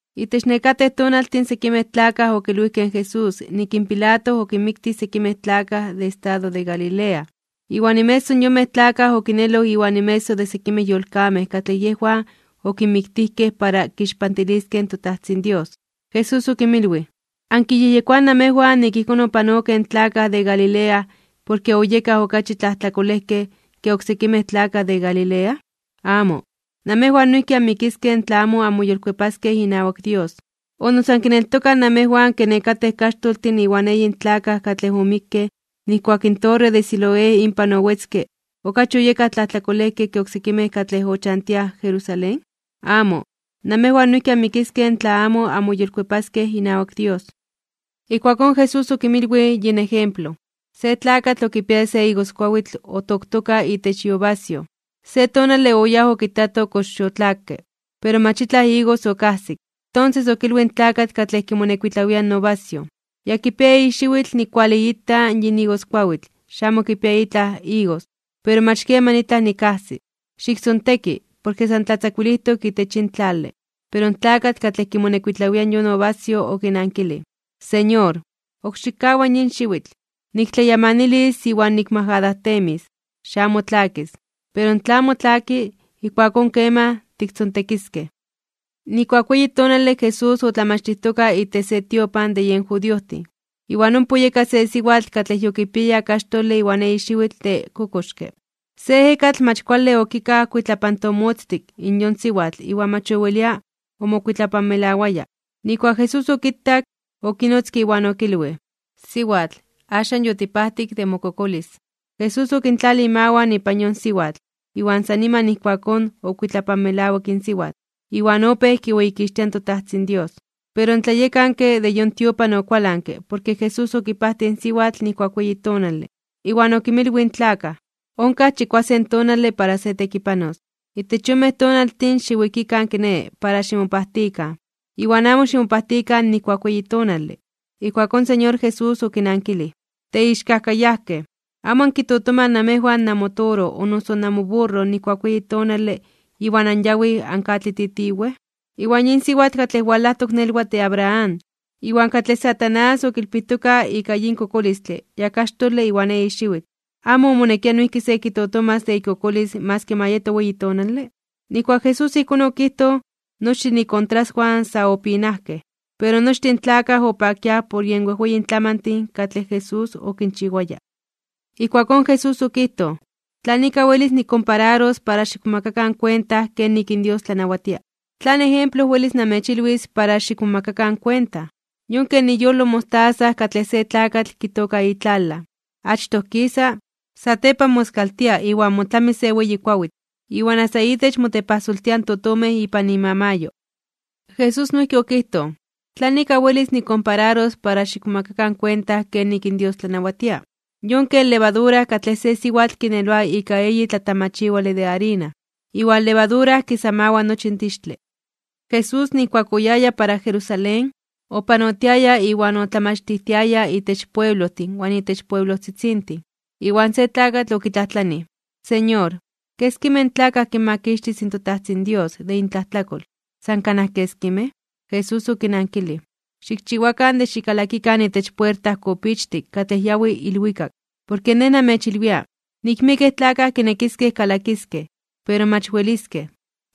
Itech nekatej tonaltin sekimej tlakaj okilwijkej in Jesús nik in Pilato okinmiktij sekimej tlakaj de estado de Galilea, iwan inmeso de yonmej tlakaj okineloj iwan inmeso de sekimej yolkamej katlej yejwan okinmiktijkej para kixpantiliskej in toTajtzin Dios. Jesús okinmilwij: ―¿Ankiyejyekoaj namejwan nik ijkón opanokej in tlakaj de Galilea porke oyekaj okachi tlajtlakolejkej ke oksekimej tlakaj de Galilea? ¡Amo! Namejwan noijki anmikiskej tla amo anmoyolkuepaskej inawak Dios. ¿O noso ankineltokaj namejwan ke nekatej kaxtoltin iwan eyin tlakaj katlej omikkej nijkuak in torre de Siloé inpan owetzke, oyekaj okachi tlajtlakolejkej ke oksekimej katlej ochantiaj Jerusalén? ¡Amo! Namejwan noijki anmikiskej tla amo anmoyolkuepaskej inawak Dios. Ijkuakón Jesús okinmilwij yin ejemplo: ―Se tlakatl okipiaya se igoskuawitl otoktoka itech iuvasyoj, se tonale oyáj okitato kox yotlakke, pero mach itlaj igos okajsik. Tonses okilwij in tlakatl katlej kimonekuitlawia in uvasyoj: “Ya kipia eyi xiwitl nikkualiita yin igoskuawitl xamo kipia itlaj igos, iwan mach keman itlaj nikajsi. Xiktzonteki, porke san tlatzakuilijtok itech yin tlale.” Pero in tlakatl katlej kimonekuitlawia yon uvasyoj okinankilij: “Señor, ok xikkawa yin xiwitl. Niktlayamanilis iwan nikmajadajtemis. Xamo tlakis. Pero tla amo tlaki, ijkuakón keman tiktzontekiskej.” Nijkuak weyi tonale Jesús otlamachtijtoka itech se tiopan de yen judiojtin. Iwan ompa oyeka se siwatl katlej yokipiaya kaxtole iwan eyi xiwitl de kokoxke. Se ejekatl mach kuale okikaj kuitlapantomotztik yon siwatl iwan mach owelia omokuitlapanmelawaya. Nijkuak Jesús okitak, okinotzke iwan okilwij: ―Siwatl, axan yotipajtik de mokokolis. Jesús okintlalij imawan ipan yon siwatl, iwan san niman ijkuakón okuitlapanmelawik in siwatl, iwan opéj kiweyikixtia in toTajtzin Dios. Pero in tlayekanke de yon tiopan okualanke porke Jesús okipajtij in siwatl nijkuak weyi tonale, iwan okinmilwij in tlakaj: ―Onkaj chikuasen tonale para se tekipanos. Itech yonmej tonaltin xiwikikan kiné para ximopajtikan, iwan amo ximopajtikan nijkuak weyi tonale. Ijkuakón in Señor Jesús okinankilij: ―Teixkajkayajkej, ¿amo ankitotomaj namejwan namotoro o noso namoburro nijkuak weyi tonale iwan anyawij ankatlititiwej? Iwan yin siwatl katlej walajtok nelwatl de Abraham, iwan katlej Satanás okilpijtoka ika yin kokolistle ya kaxtole iwan eyi xiwitl, ¿amo omonekia noijki se kitotomas de ikokolis maski ma yeto weyi tonale? Nijkuak Jesús ijkón okijtoj, nochtin ikontraswan sa opinajkej. Pero nochtin in tlakaj opakiaj por yen wejweyin tlamantin katlej Jesús okinchiwaya. Ijkuakón Jesús okijtoj: ―¿Tlan ika welis nikkompararos para xikmomakakan kuenta kenik in Dios tlanawatia? ¿Tlan ejemplo welis namechilwis para xikmomakakan kuenta? Yon ken iyolo in mostaza katlej se tlakatl kitooka itlalaj. Achtoj kisa, satepan moskaltia iwan motlami se weyi kuawitl, iwan asta itech motepajsoltiaj in totomej ipan imamayo. Jesús noijki okijtoj: ―¿Tlan ika welis nikkompararos para xikmomakakan kuenta kenik in Dios tlanawatia? Yon ken levadura katlej se siwatl kineloa ika eyi tlatamachiwale de arina, iwan levadura kisamawa nochi in tixtle. Jesús nijkuak oyaya para Jerusalén, opanotiaya iwan otlamachtijtiaya itech pueblojtin iwan itech pueblojtzitzintin. Iwan se tlakatl okitlajtlanij: ―Señor, ¿keskimej tlakaj kinmakixtis in toTajtzin Dios de intlajtlakol? ¿San kanaj keskimej? Jesús okinankilij: ―Xikchiwakan de xikalakikan itech puerta kopichtik katlej yawi ilwikak. Porke Nej namechilwia, nik miekej tlakaj kinekiskej kalakiskej, pero mach weliskej.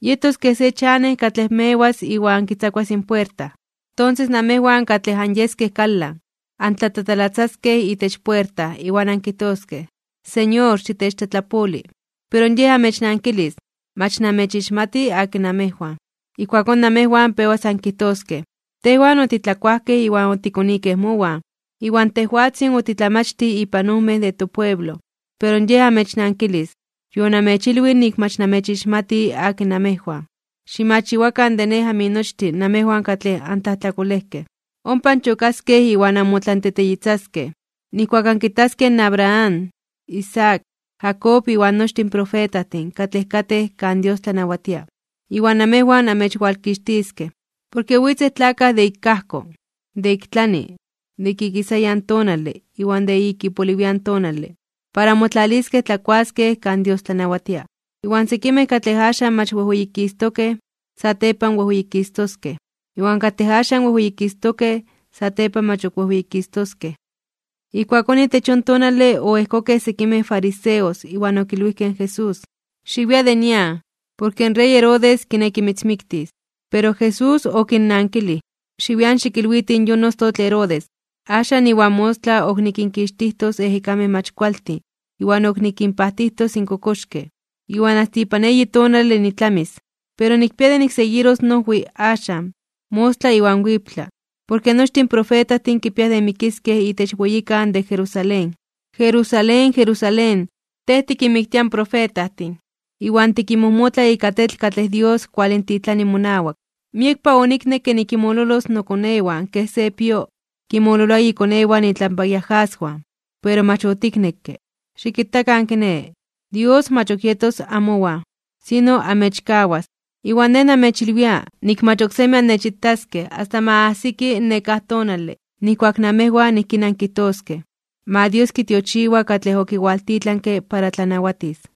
Yetos kej se chanej katlej mewas iwan kitzakuas in puerta. Tonses namejwan katlej anyeskej kalan, antlatatalatzaskej itech puerta iwan ankijtoskej: “Señor, xitechtlatlapoli.” Pero yej amechnankilis: “Mach namechixmati akin namejwan.” Ijkuakón namejwan pewas ankijtoskej: “Tejwan otitlakuajkej iwan otikonikej mowan, iwan tejwatzin otitlamachtij ipan ojmej de topueblo.” Pero yej amechnankilis: “Yonamechilwij nik mach namechixmati akin namejwan. Ximachiwakan de Nej aminochtin namejwan katlej antlajtlakolejkej.” Ompa anchokaskej iwan anmotlanteteyitzaskej, nijkuak ankitaskej in Abraham, Isaac, Jacob iwan nochtin in profetajtin katlej katej kan Dios tlanawatia, iwan namejwan amechwalkixtiskej. Porke witzej tlakaj de ik ajko, de ik tlani, de ik ikisayan tonale iwan de ik ipoliwian tonale, para motlaliskej tlakuaskej kan Dios tlanawatia. Iwan sekimej katlej axan mach wejweyikistokej (weyititokej) satepan wejweyikistoskej, iwan katlej axan wejweyikistokej satepan mach ok wejweyikistoskej. Ijkuakón itech yon tonale oejkokej sekimej fariseos iwan okilwijkej in Jesús: ―Xiwia de nian, porke in rey Herodes kineki mitzmiktis. Pero Jesús okinnankilij: ―Xiwian xikilwitij yon ostotl Herodes: “Axan iwan mostla ok nikinkixtijtos ejekamej mach kualtin iwan ok nikinpajtijtos in kokoxkej, iwan asta ipan eyi tonale nitlamis.” Pero nikpia de nikseguiros noojwi axan, mostla iwan wiptla, porke nochtin in profetajtin kipiaj de mikiskej itech weyikan de Jerusalén. ’¡Jerusalén, Jerusalén, tej tikinmiktia in profetajtin, iwan tikinmojmotla ika tetl katlej Dios kualintitlani monawak! ¡Miekpa oniknekke nikinmololos mokonewan, kej se pio kinmololoa ikonewan itlampa iajaswan, pero mach otiknekke! Xikitakan kiné, Dios mach ok yetos amowan, sino amechkawas. Iwan Nej namechilwia, nik mach oksemi annechitaskej asta ma ajsiki in nekáj tonale nijkuak namejwan ijkín ankijtoskej: “Ma Dios kitiochiwa katlej okiwaltitlanke para tlanawatis.”